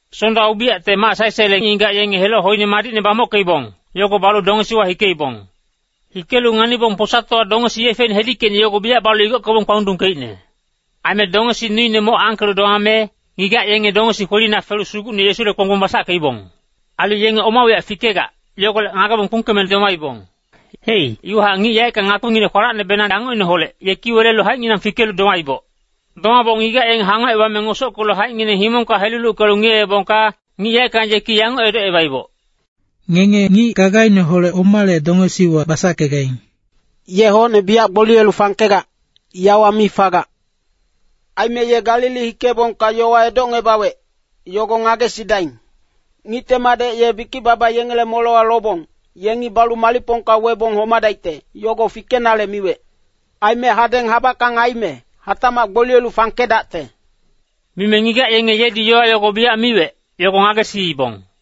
Sonda ubiyacte mac sae-saele ngigac yenge heloc hoine madicne bamockeibong, yogo balu dongesiwa hikeibong. Hikelu nganibong posatowa dongesi yefeine hedickeicne yogo biyac balu igockebong kpalundungkeicne. Aime dongesi nuine moc angkelu domame, ngigac yenge dongesi kwelina felu Sugucne Yesule kponggbong basackeibong. Ailu yenge oma wiyac fikegac, yogolec ngagebong kpungkeme domaibong. Hei, iwahac ngic yaeckang ngakpinginec kwalacnebenang angocineholec, yeki welelu haicnginang fikelu domaiboc. Domaboc ngigac yenge hangocebame ngosockelu haicngineng himongka heluluckelu ngiyeebongka, ngic yaeckang yeki yanguc edocebaiboc, “Ngenge ngic gagaineholec omale dongesiwa basackegaing? Ye hocne biyac gboliyelu fangkegac, yawa mi fagac. Aime ye Galili hikeebongka yowa edocngebawec, yogo ngagesidaing. ‘Ngicte Madec ye bikic-baba yengele molewa lobong, yengi balu malicpongka webong homadaicte,’ yogo fikenale miwec. ‘Aime hadeng habackang aime, hatacmac gboliyelu fangkedacte.’” Mime ngigac yenge yedi yowa yogo biyac miwec, yogo ngagesiibong.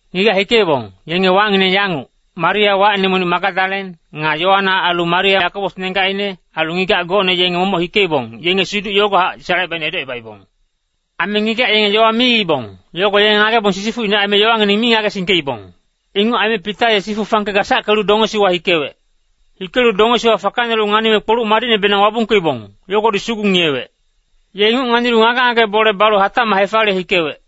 Ngigac hikeibong, yenge wacngineng yanguc, Maria, wacine monic Magadalen, nga Yoana. Ailu Maria Yakobos nenggacine, ailu ngigac gocne yenge momoc hikeibong, yenge siduc yogohac salecebaicne edocebaibong. Aime ngigac yenge yowa miibong, yogo yenge ngagebong sisifucine aime yowangineng mi ngagesingkeibong. Inguc aime Pita ye sifu fangke gasackelu dongesiwa hikewec. Hikelu dongesiwa fakanelu nganime, kpoluc madicnebenang wabungkeibong, yogodi sugu ngiyewec. Ye inguc nganilu ngage-ngage bole balu hatacmac hefaliye hikewec.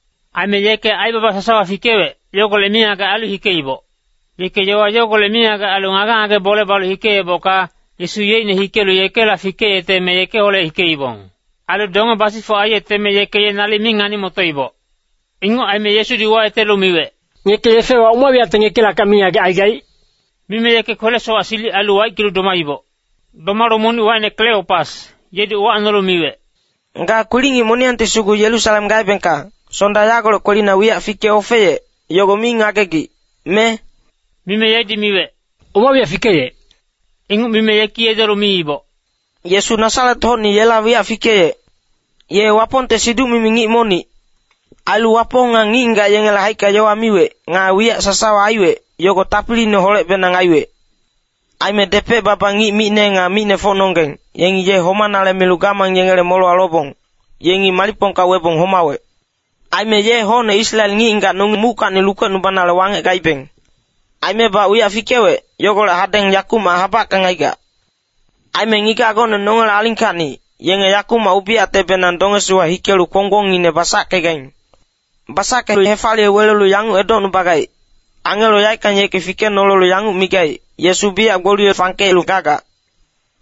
Aime yeke aibaba sasawa fikewec, yogolec mingagec ailu hikeiboc. Yeke yowa yogolec mingagec ailu ngage-ngage bole balu hikeebocka, Yesu yeicne hikelu yekela fikeyeteme yekeholec hikeibong. Ailu donge basifuc aiyeteme yeke ye nalic mi ngani-motoiboc. Inguc aime Yesudi uwayetelu miwec, “Ngeke yefewa oma wiyacte ngekilackac mingagec aigaic?” Mime yeke kwele-sowac silic ailu waickelu domaiboc. Domalu monic wacine Kleopas, yedi uwacnolu yanguc miwec, “Ga kwilic-ngic moniyangti sugu Yerusalem gaebengka, Sonda yagolec kwelina wiyac fike ofeyec, yogo mi ngagegic, me?” Mime yedi miwec, “Oma wiyac fikeyec?” Inguc mime yeki edolu miiboc, “Yesu Nasaret-hocni yela wiyac fikeyec. Ye Wapongte siduc-mimi ngic monic. Ailu Wapong nga ngic-ngigac yengele haicka yowa miwec, nga wiyac sasawa aiwec, yogo tapiliineholecbenang aiwec. Aime depec-baba ngic micne nga micnefocnonggeng, yengi ye homanale milu gamang yengele molewa lobong, yengi malicpongka webong homawec. Aime ye hocne Israel ngic-ngigac nonge muckacni lukecnubanale wangec gaibeng. Aimebac wiyac fikewec, yogolec hadeng yakumac habackang aigac. Aime ngigac gocne nongele alingkacni, yenge yakumac ubiyactebenang dongesiwa hikelu kponggbongine basackegaing. Basackelu hefaliye welelu yanguc edocnubagaing, ‘Angelo yaeckang yeki fikenolelu yanguc migaic, “Yesu biyac gboliye fangkelu gagac!” ’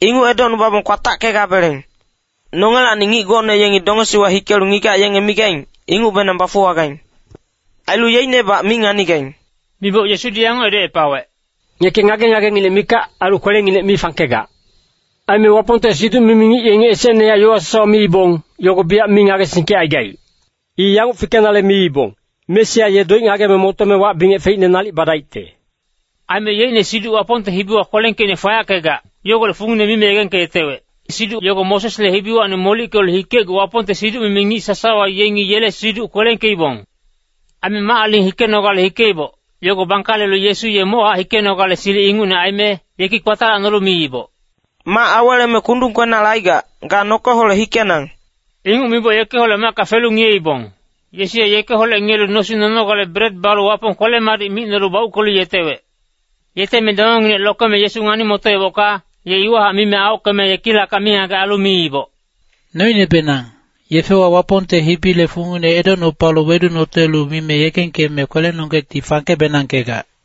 Inguc edocnubabong kwatackegabeleng. Nongelacni ngic gocne yengi dongesiwa hikelu ngigac yenge migaing, ingucbenang bafuwagaing. Ailu yeicnebac mi nganigaing.” Miboc Yesudi yanguc edocepawec, “Ngeke ngage-ngagenginec mikac, ailu kwelenginec mi fangkegac. Aime Wapongte siduc-mimi ngic yengi esecnehac yowa sasawa miibong, yogo biyac mi ngagesingkecaigaic. I yanguc fikenale miibong, ‘Mesia ye doic ngageme motome wac-bingec feicne nalic badaicte.’” Aime yeicne siduc Wapongte hibiwa kwelengkeicne fayackegac, yogolec fungine mime yegengkeyetewec. Siduc yogo Mosesle hibiwacni molickelu hikecgu Wapongte siduc-mimi ngic sasawa yengi yele siduc kwelengkeibong. Aime mac-aling hikenogale hikeiboc, yogo bangkalelu Yesu ye mochac hikenogale silic ingucne aime, yeki kpatalacnolu miiboc, “Mac aweleme kundung kwenale aigac, ga nokeholec hikenang!” Inguc miboc yekeholec macka felu ngiyeibong. Yesu ye yekeholec ngiyelu nosing nonogale bret balu Wapong kwele-madic micnolu bauckelu yetewec. Yeteme dongenginec lokeme Yesu ngani-motoebocka, ye iwahac mime aockeme yekilackac mingagec ailu miiboc, “Noinebenang, yefewa Wapongte hibile fungine edocnupalu wedunotelu mime yegengkeme kwelenonggecti fangke-benangkegac.”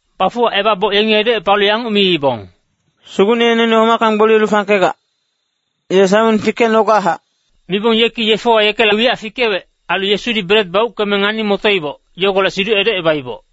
Bafuwacebaboc yengi edocepalu yanguc miibong, “Sugucne ye noine homackacni gboliyelu fangkegac, ye Saimon fikecnogachac!” Mibong yeki yefewa yekela wiyac fikewec, ailu Yesudi bret bauckeme ngani-motoiboc, yogolec siduc edocebaiboc.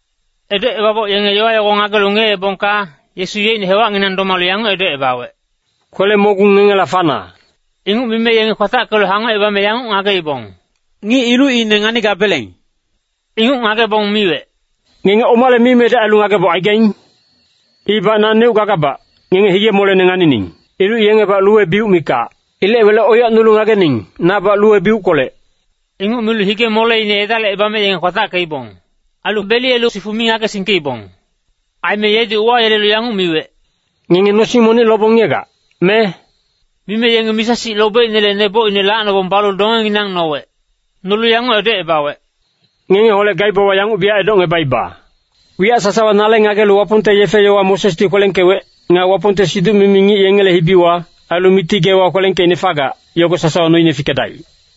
Edocebaboc yenge yowa yogo ngagelu ngiyeebongka, Yesu yeicne hewacnginang domalu yanguc edocebawec, “Kwele-mogung ngengela fana.” Inguc mime yenge kwatackelu hangocebame yanguc ngageibong, “Ngic ilucine nganigabeleng.” Inguc ngagebong miwec, “Ngenge omale mimedec ailu ngageboc aigaing? Ibac naneuc gagabac, ngenge hige-molene nganining. Iluc yengebac luwe-biuc mikac. Ilec wele oiyacnulu ngagening, nabac luwe-biuckolec.” Inguc milu hige-moleine edalicebame yenge kwatackeibong. Ailu beliyelu sifu mi ngagesingkeibong. Aime yedi uwayelelu yanguc miwec, “Ngenge nosing monic lobong ngiyegac, me?” Mime yenge misa-sic lobeicnele nebocine lacnobong balu dongenginang nowec. Nolu yanguc edocebawec, “Ngengeholec gaibawa yanguc biyac edocngebaiba. Wiyac sasawa nale ngagelu Wapongte yefe-yowa Mosesdi kwelengkewec, nga Wapongte siduc-mimi ngic yengele hibiwa, ailu Miti geewa kwelengkeicne fagac, yogo sasawa noine fikedaic.”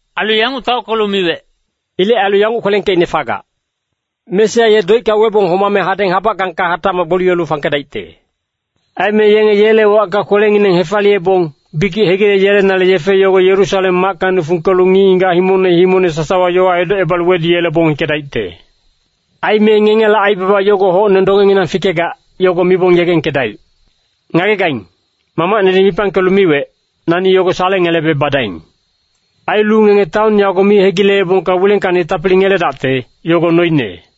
Ailu yanguc taockelu miwec, “Ilec ailu yanguc kwelengkeicne fagac. Mesia ye doicka webong homame hadeng habackangka hatacmac gboliyelu fangkedaicte. Aime yenge yele wacka kwelengineng hefaliyebong, bikic hegileyelenale yefe yogo Yerusalem mackacni fungkelu ngic-ngigac himongne himongne sasawa yowa edocebalu weduyelebong hikedaicte. Aime ngengela aibaba yogo hocne dongenginang fikegac, yogo mibong yegengkedaic. Ngagegaing, Mamacnedi mipangkelu miwec, nani yogo salengelebe badaing. Ailu ngenge taon yago mi hegileebongka wilengkacni tapili ngeledaicte, yogo noine.”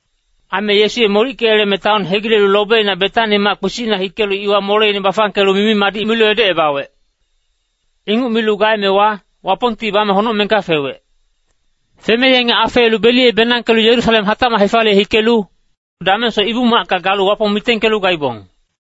Aime Yesu ye molickeyeleme taon hegilelu lobina Betani mac-kpisicna hikelu iwa moleine bafangkelu mimi-madic milu edocebawec. Inguc milu gaemewa, Wapongti bame honocmengka fewec. Feme yenge afeelu beliyebenangkelu Yerusalem hatacmac hefaliye hikelu, damengsoc Ibu-macka galu Wapong mitengkelu gaibong.